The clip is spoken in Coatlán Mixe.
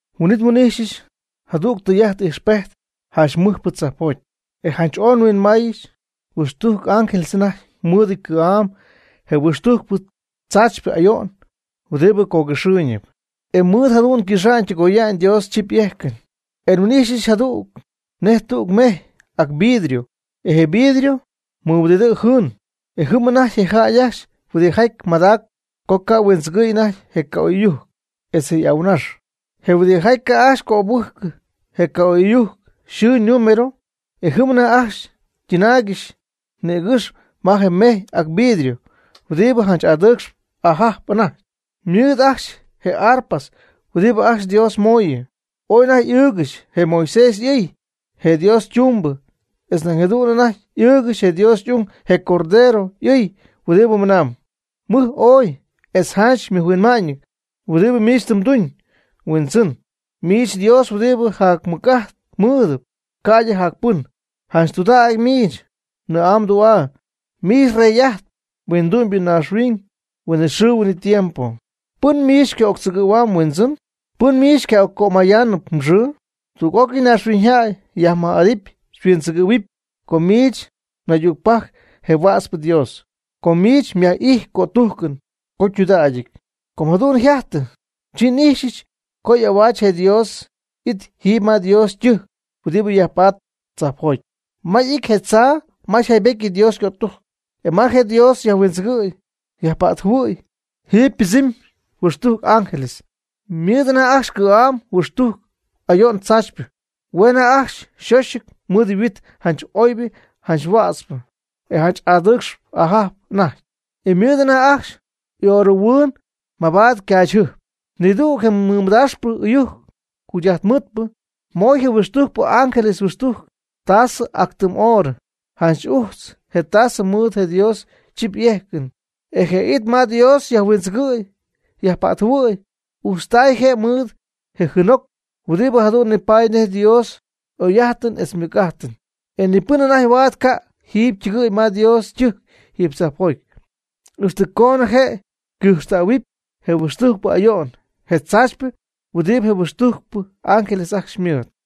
Huin'it nhuin'ijxyɨch jadüg tɨy'ajt ijxpejt janch mɨjpɨ tzajpjoty, e janch oy huinmaayñɨ. Huixtujc ángeles anajty mɨɨdɨty cɨ̈'am je huixtujcpɨ tzaachypɨ ayo'n huɨdi cogɨxɨɨyñɨp, e mɨɨd jadu'n ycɨxa'ñ ytɨgoya'ñ Dios chip y'ejcɨn. E nhuin'ijxyɨch jadu'n nej tüg mejy ac vidrio, e je vidrio mɨhuɨdidɨɨ jɨɨn. E jɨm anajty je jäy ajcxy huɨdijaty madac co ca' huindzɨgɨ̈y anajty je ca'oy'ɨyujc etz je' y'ahuɨnax, je huɨdijaty ca' ajcxy cöbɨjcɨ je ca'oy'ɨyujc yxɨɨ ñinúmero. E jɨm anajty ajcxy ytɨnaaygɨxy nïgɨxy ma je mejy ac vidrio huɨdibɨ janch adɨɨcxp ajajp anajty, ymɨɨd ajcxy je arpas huɨdibɨ ajcxy Dios mooyɨ. Ooy anajty ɨɨgɨxy je Moisés y'ɨy, je Dios ytumbɨ etz nañ jadu'n anajty ɨɨgɨxy je Dios y'ung, je Cordero, y'ɨy huɨdibɨ mɨnamb: Mɨj ooy, etz janch mɨjhuinma'ñ huɨdibɨ miich tɨ mduñ. Huindzɨn, miich Dios huɨdibɨ jac mɨc'ajt mɨɨdɨp ca'ydɨ jac pɨn. Janch tudägy miich mnɨɨ'aa mdu'aa. Miich rey'ajtp huindu'myñaaxhuiñ huinɨxɨɨ huinɨtiempo. ¿Pɨn miich xyca'octzɨgɨ̈huamb, Huindzɨn? ¿Pɨn miich xyca'occömayaanɨp mxɨɨ? Tug'ócɨy naaxhuiñyjäy xyajmɨj'adɨpy xyhuindzɨgɨ̈huɨpy, com miich naydügpajc je huätzpɨ Dios, com miich nyaj'ijxp mgötujcɨn co ytudägɨty. Co jadu'n yjajtɨ, chi n'ijxyɨch co y'ahuaach je Dios y'it jiiby ma Dios ytɨjc huɨdibɨ yajpatp tzajpjoty, ma y'ity je tzaa ma yjaybetyɨty Dios ycötujcɨn. E ma je Dios yajhuindzɨgɨ̈y yajpa'tjɨhuɨ̈y, jiiby ypɨdzɨɨmy huixtujc ángeles. Ymɨɨd anajty ajcxy ycɨ̈'am huixtujc ayo'n tzaachypɨ. Hue' anajty ajcxy yxoxɨty mɨɨd huit janch oybɨ janch huätzpɨ, e janch adɨɨcxp ajajp anajty. Ymɨɨd anajty ajcxy oorɨhuɨɨn mabaad ycaachyjɨjp. Nidüg je mɨdaaxpɨ ɨyujc jugy'ajtmɨɨdpɨ moy je huixtujcpɨ y'ángeles huixtujc tasɨ ac tɨm oorɨ, janch ujtz je tasɨ mɨɨd je Dios chip y'ejcɨn. E je it ma Dios yajhuindzɨgɨ̈y yajpa'tjɨhuɨ̈y yajpa'tjɨhuɨ̈y ujtztay je' mɨɨd je jɨɨnjoc huɨdibɨ jadu'n ñipatpy nej je Dios y'oy'ajtɨn etz Dios ymɨc'ajtɨn. E ni pɨn anajty huaad ca' jiiby ytɨgɨ̈y ma je Dios ytɨjc jiiby tzajpjoty, ixtɨ coonɨ je' ycɨjxtähuɨpy je huixtujcpɨ ayo'n, je tzaachypɨ huɨdibɨ je huixtujcpɨ ángeles ajcxy ymɨɨd.